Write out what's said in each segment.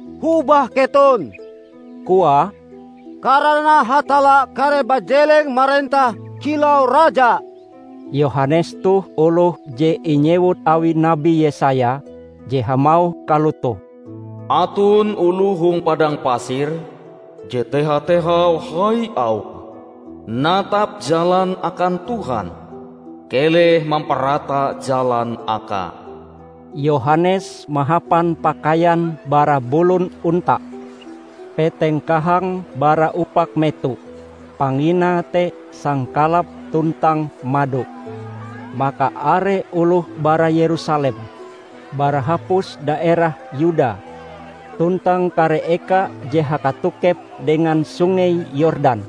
"Hobah keton," koae, "karana Hatalla kareh bajeleng marentah kilau Raja!" Yohanes toh oloh je inyewut awi Nabi Yesaya je hamauh kalotoh, "Aton oloh hong padang pasir, je teha-tehau hai auhe, 'Natap jalan akan Tuhan; keleh mamparata jalan Akae.' " Yohanes mahapan pakaian bara bulon onta. Peteng kahange bara upak meto, panginae te sangkalap tuntang mado. Maka are oloh bara Yerusalem, bara hapus daerah Yuda tuntang kare eka je hakatokep dengan Sungei Yordan,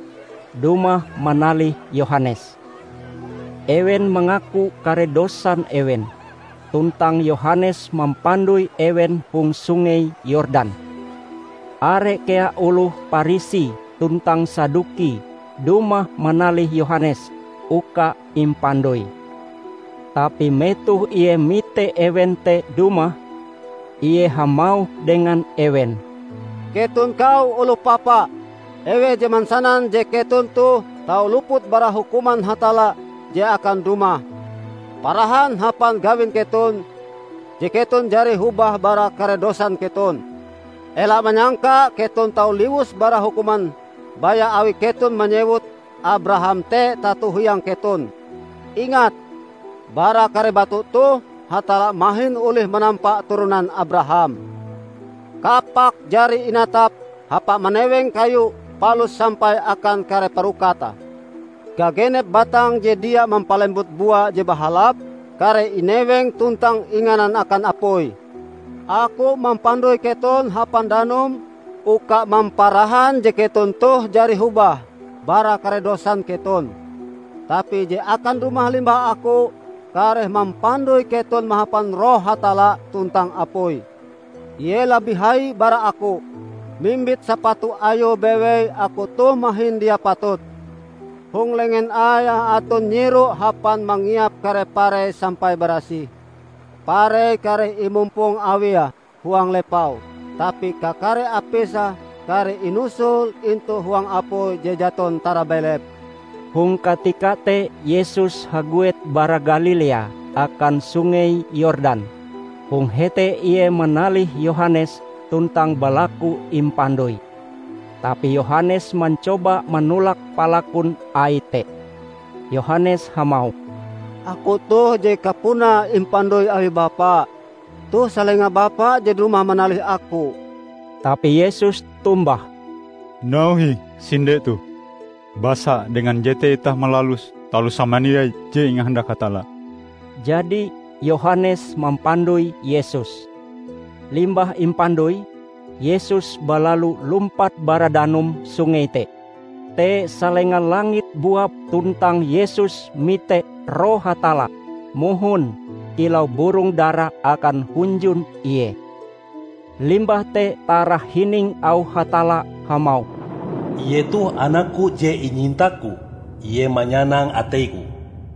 dumah manalih Yohanes. Ewen mangaku kare dosan ewen, tuntang Yohanes mampandoi ewen hong Sungei Yordan. Are kea oloh Parisi tuntang Saduki dumah manalih Yohanes uka impandoi. Tapi metoh ie mite ewen te dumah, ie hamauh dengan ewen, "Keton kau oloh papa! Eweh je mansanan je keton toh tau luput bara hukuman Hatalla je akan dumah? Parahan hapan gawin keton je keton jari hobah bara kare dosan keton. Ela manyangka keton tau liwus bara hukuman baya awi keton manyewut Abraham te tato hiang keton. Ingat, bara kare batu toh, Hatalla mahin olih manampa turonan Abraham! Kapak jari inatap hapa maneweng kayu palus sampai akan kare parokate. Gagenep batang je dia mampalembut bua je bahalap, kareh ineweng tuntang inganan akan apui. Aku mampandoi keton hapan danum uka mamparahan je keton toh jari hobah bara kare dosan keton: tapi je akan dumah limbah aku, kareh mampandoi keton mahapan Roh Hatalla tuntang apui. Ie labih hai bara aku. Mimbit sapatu Ayue bewei aku toh mahin dia patut. Hong lengen Aie aton nyiro hapa mangiap kare parei sampai barasih. Parei kareh imumpong Awie huang lepau, tapi kakare apise kareh inusul intu huang apui je jaton tarabelep." Hong katika te Yesus haguet bara Galilea akan Sungei Yordan. Hong hete Ie manalih Yohanes tuntang balaku impandoi. Tapi Yohanes mancoba manolak palakun Aie te. Yohanes hamauh, "Aku toh je kapunae impandoi awi Bapa. Toh salenga Bapa je dumah manalih aku." Tapi Yesus tombah, "Nauhe ih sinde toh. Basa dengan jete itah malalus taloh samandiai je ingahandak Hatalla." Jadi Yohanes mampandoi Yesus. Limbah impandoi, Yesus balalu lumpat bara danum sungei te. Te salenga langit buap tuntang Yesus mite Roh Hatalla mohon kilau burong dara akan hunjun Ie. Limbah te tarahining auh Hatalla hamauh, "Ie toh Anak-Ku je inyinta-Ku. Ie manyanang atei-Ku."